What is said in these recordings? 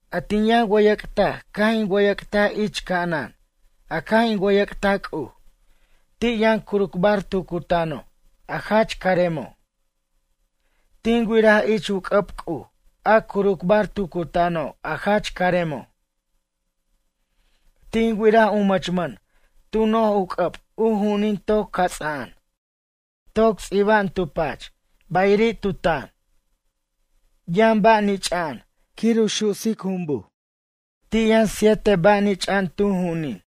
A tin wʌyʌc'taj caj in wʌyʌc'taj ich ca'anan a caj in wʌyʌc'taj C'uj, ti' yʌn curucbar tu cutano' a jach caremo'. Tin wiraj ich u c'ʌb C'uj a curucbar tu cutano' a jach caremo'. Tin wiraj u mʌchmʌn tu noj u c'ʌb u ju'unin toc cats'a'an. Toc ts'iba'an tu pach bayiri' tu tan. Yʌn ba' nich'a'an quir u su'sic jumbuj. Ti' yʌn siete ba' nich'a'an tu ju'unin.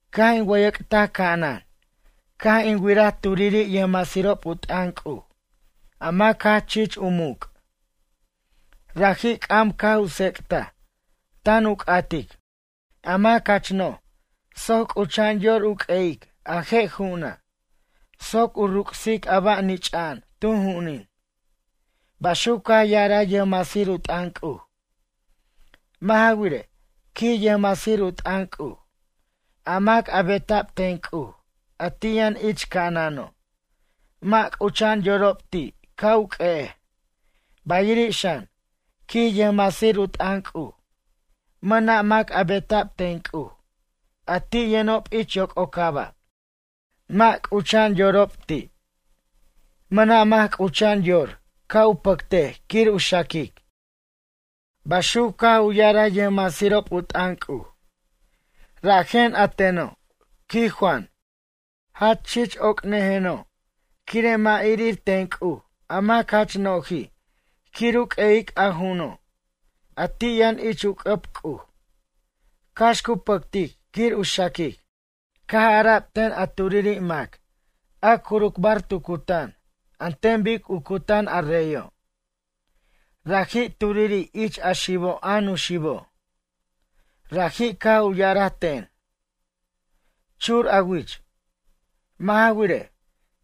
Caj in wʌyʌc'taj ca'anan, caj in wiraj turiri' yʌjmasirob u t'ʌn C'uj, a mac jach chich u muc'. Raji' c'am caj u tsec'taj, tan u c'atic: A mac jach no'j soc c'ucha'an yor u q'ueyic a je' ju'una', soc u ruc'sic a ba' nich'a'an tu ju'unin? Baxuc caj ya'araj yʌjmasir u t'ʌn C'uj. Mʌ' ja wirej, quij yʌjmasir u t'ʌn C'uj, a mac a beta'b ten C'uj, a ti' yʌn ich ca'anano', mʌ' c'ucha'an u yorob ti' ca' u q'ue'ej. Bayiri' xan, quij yʌjmasir u t'ʌn C'uj, mʌna' mac a beta'b ten C'uj a ti' yʌnob ich yoc'ocaba', mʌ' c'ucha'an yorob ti'. Mʌna' mac c'ucha'an yor ca' u pʌctej quir u xaquic. Baxuc caj u ya'araj yʌjmasirob u t'ʌn C'uj. Rajen a teno', quij Juan, jach chich oc'nʌjeno', quire' mʌ' irir ten C'uj a mac jach no'ji' quir u q'ue'ic a ju'uno', a ti' yʌn ich u c'ʌb C'uj, cax cu pʌctic quir u xaquic. Caj ara'b ten a turiri' mac a curucbar tu cutan, an ten bic u cutan a reyo'. Raji' turiri' ich a xibo' a nuxibo'. Raji' caj u ya'araj ten: ―Chur a wich. Mʌ' ja wirej,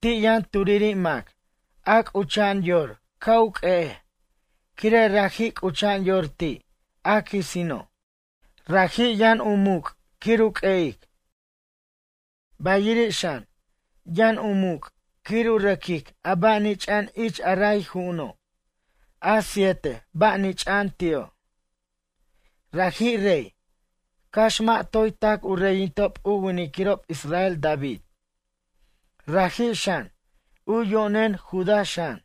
ti' yʌn turiri' mac a c'ucha'an yor ca' u q'ue'ej, quire' raji' c'ucha'an yor ti' a quisino', rajij yʌn u muc' quir u q'ue'ic. Bayiri' xan, yʌn u muc' quir u rʌquic a ba' nich'a'an ich a ray ju'uno', a siete ba' nich'a'an ti'o'. Raji' rey, cax mʌ' toy tac u reyinticob u winiquirob israel David. Raji' xan, u yo'nen Judá xan.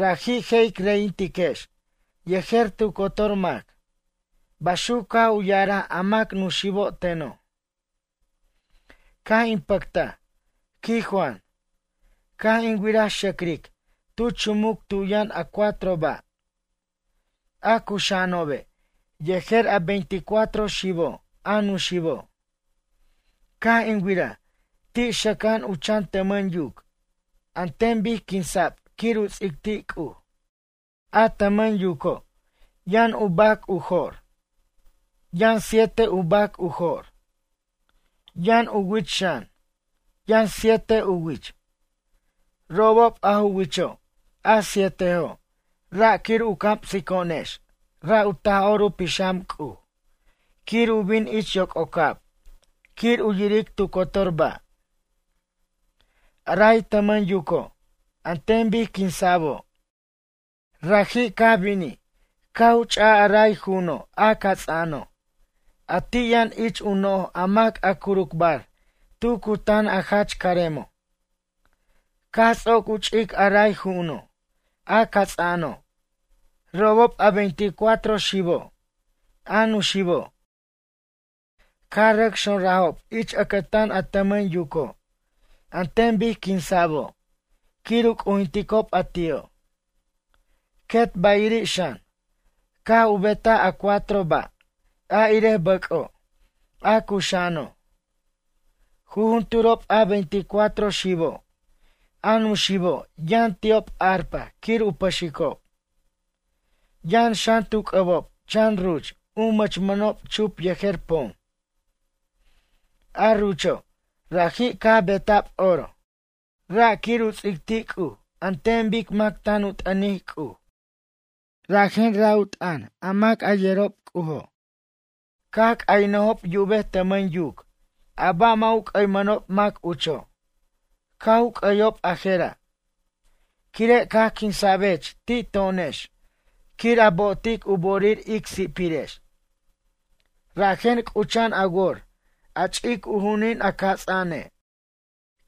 Raji' je' ic reyintiquex yejer tu cotor mac. Baxuc caj u ya'araj a mac nuxibo' teno'. Caj in pʌctaj, quij Juan, caj in wiraj xʌcric tu chumuc tu yʌn a cuatro ba', a cuxa'anobe', yejer a veinticuatro xibo', a nuxibo'. Caj in wiraj, ti' xʌca'an u chan tʌmʌn yuc an ten bic quinsa'b quir u ts'ic ti' C'uj. A tʌmʌn yuco', yʌn u bac u jo'r. Yʌn siete u bac u jo'r. Yʌn u wich xan, yʌn siete u wich. Robob a ju wicho' a sietejo', ra' quir u camsico'onex ra' u Taj'or u Pixam C'uj quir u bin ich yoc'ocab quir u yiric tu cotor ba'. A ray tʌmʌn yuco' an ten bic quinsa'bo', raji' caj binij caj u ch'aj a ray ju'uno', a cats'mʌno', a ti' yʌn ich u noj a mac a curucbar tu cutan a jach caremo'. Caj ts'oc u ch'ic a ray ju'uno', a cats'a'ano'. Robob a veinticuatro xibo', a nuxibo', caj rʌc xonrajob ich ʌcʌtan a tʌmʌn yuco', an ten bic quinsa'bo', quir u c'ujinticob a ti'o'. Quet bayiri' xan, caj u betaj a cuatro ba' a irej bʌc'o', a cuxa'ano'. Jujunturob a veinticuatro xibo', a nuxibo' yʌn ti'ob arpa quir u pʌxicob. Yʌn xan tu c'ʌbob chan ruch u mʌchmʌnob chup yejer pom. A rucho', raji' caj beta'b oro. Ra' quir u ts'ic ti' C'uj an ten bic mac tan u t'ʌnic C'uj, rajen ra' u t'ʌn a mac a yerob C'ujo'. Caj c'aynʌjob yubej tʌmʌn yuc a ba' mʌ' u c'ʌymʌnob mac ucho'. Caj u c'ʌyob a jera': Quire' caj quinsa'bech ti' to'onex quir a bo'otic u bo'orir ic si'pirex, rajen c'ucha'an a wor a ch'ic u ju'unin a cats'a'ane'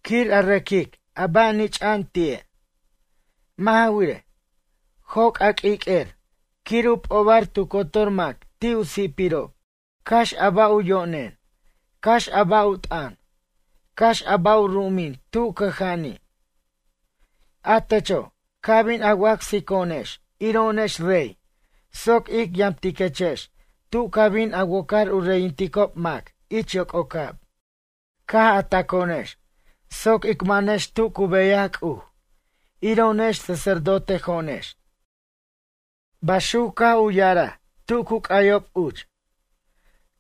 quir a rʌquic a ba' nich'a'an ti'e'. Mʌ' ja wirej, joc' a q'uiq'uer quir u p'obar tu cotor mac ti' u si'pirob, cax a ba' u yo'nen, cax a ba' u t'ʌn, cax a ba' u ru'umin tu cʌja'ani'. A techo', ca bin a wacsico'onex iro'onex rey soc ic yamtiquechex tu ca bin a wocar u reyinticob mac ich yoc'ocab. Caj a taco'onex soc ic manex tu cu beyaj C'uj iro'onex sacerdotejo'onex. Baxuc caj u ya'araj tu cu c'ayob uch.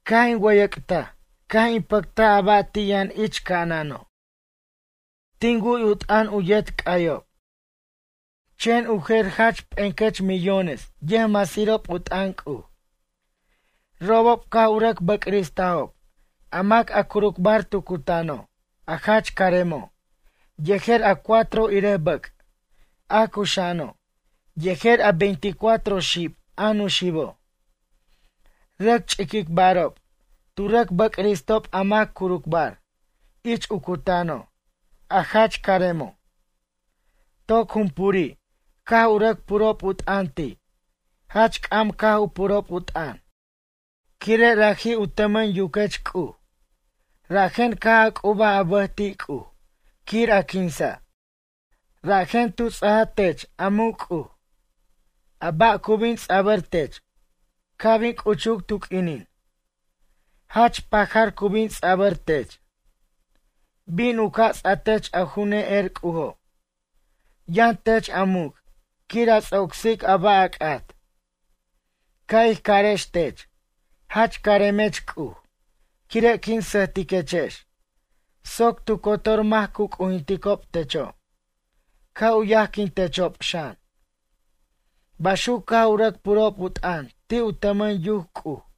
Caj in wʌyʌc'taj caj in pʌctaj a ba' ti' yʌn ich ca'anano'. Tin wu'y u t'ʌn u yet c'ayob. Chen u jer jach p'encʌch millones yʌjmasirob u t'ʌn C'uj. Robob caj u rʌc bʌcristajob a mac a curucbar tu cutano', a jach caremo' yejer a cuatro irej bʌc', a cuxa'ano' yejer a veinticuatro xib, a nuxibo'. Rʌc ch'iquicbarob, tu rʌc bʌcristob a mac a curucbar ich u cutano', a jach caremo'. Toc jumpuri' caj u rʌc purob u t'ʌn ti'. Jach c'am caj u purob u t'ʌn: Quire' raji' u tʌmʌn yuquech C'uj, rajen caj a c'ubaj a bʌj ti' C'uj quir a quinsa', rajen tu ts'aj tech a muc' C'uj. A ba' cu bin ts'abʌr tech ca' bin c'uchuc tu q'uinin, jach pajar cu bin ts'abʌr tech. Bin u ca' ts'a tech a ju ne'er C'ujo'. Yʌn tech a muc' quir a ts'ocsic a ba' a c'at. Ca' ij carex tech: Jach caremech C'uj quire' quin sʌjtiquechex soc tu cotor mac cu c'ujinticob techo', ca' u yajquintechob xan. Baxuc caj u rʌc purob u t'ʌn ti' u tʌmʌn yuc C'uj.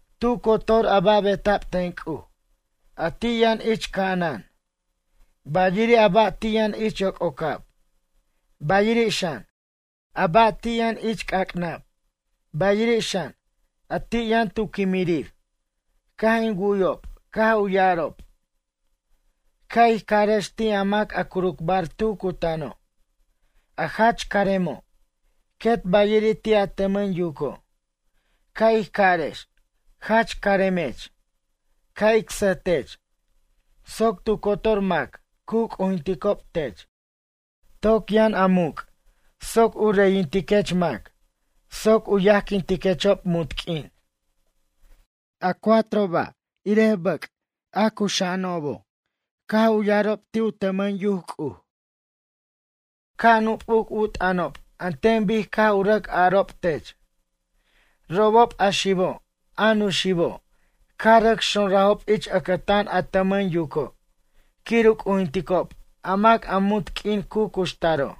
Tu cotor a ba' beta'b ten C'uj, a ti' yʌn ich ca'anan, bayiri' a ba' ti' yʌn ich yoc'ocab, bayiri' xan, a ba' ti' yʌn ich c'ac'nab, bayiri' xan, a ti' yʌn tu quimirir, caj in wu'yob caj u ya'arob: Ca' ij carex ti' a mac a curucbar tu cutano', a jach caremo', quet bayiri' ti' a tʌmʌn yuco'. Ca' ij carex, jach caremech, ca' ic sʌj tech soc tu cotor mac cu c'ujinticob tech. Toc yʌn a muc' soc ic reyintiquech mac soc u yajquintiquechob munt q'uin. A cuatro ba', irej bʌc', a cuxa'anobo', caj u ya'arob ti' u tʌmʌn yuc C'uj: “Ca' nup'uc u t'ʌnob an ten bic caj u rʌc a'arob tech.” Robob a xibo' a nuxibo' caj rʌc xonrajob ich ʌcʌtan a tʌmʌn yuco' quir u c'ujinticob a mac a munt q'uin cu cuxtaro'.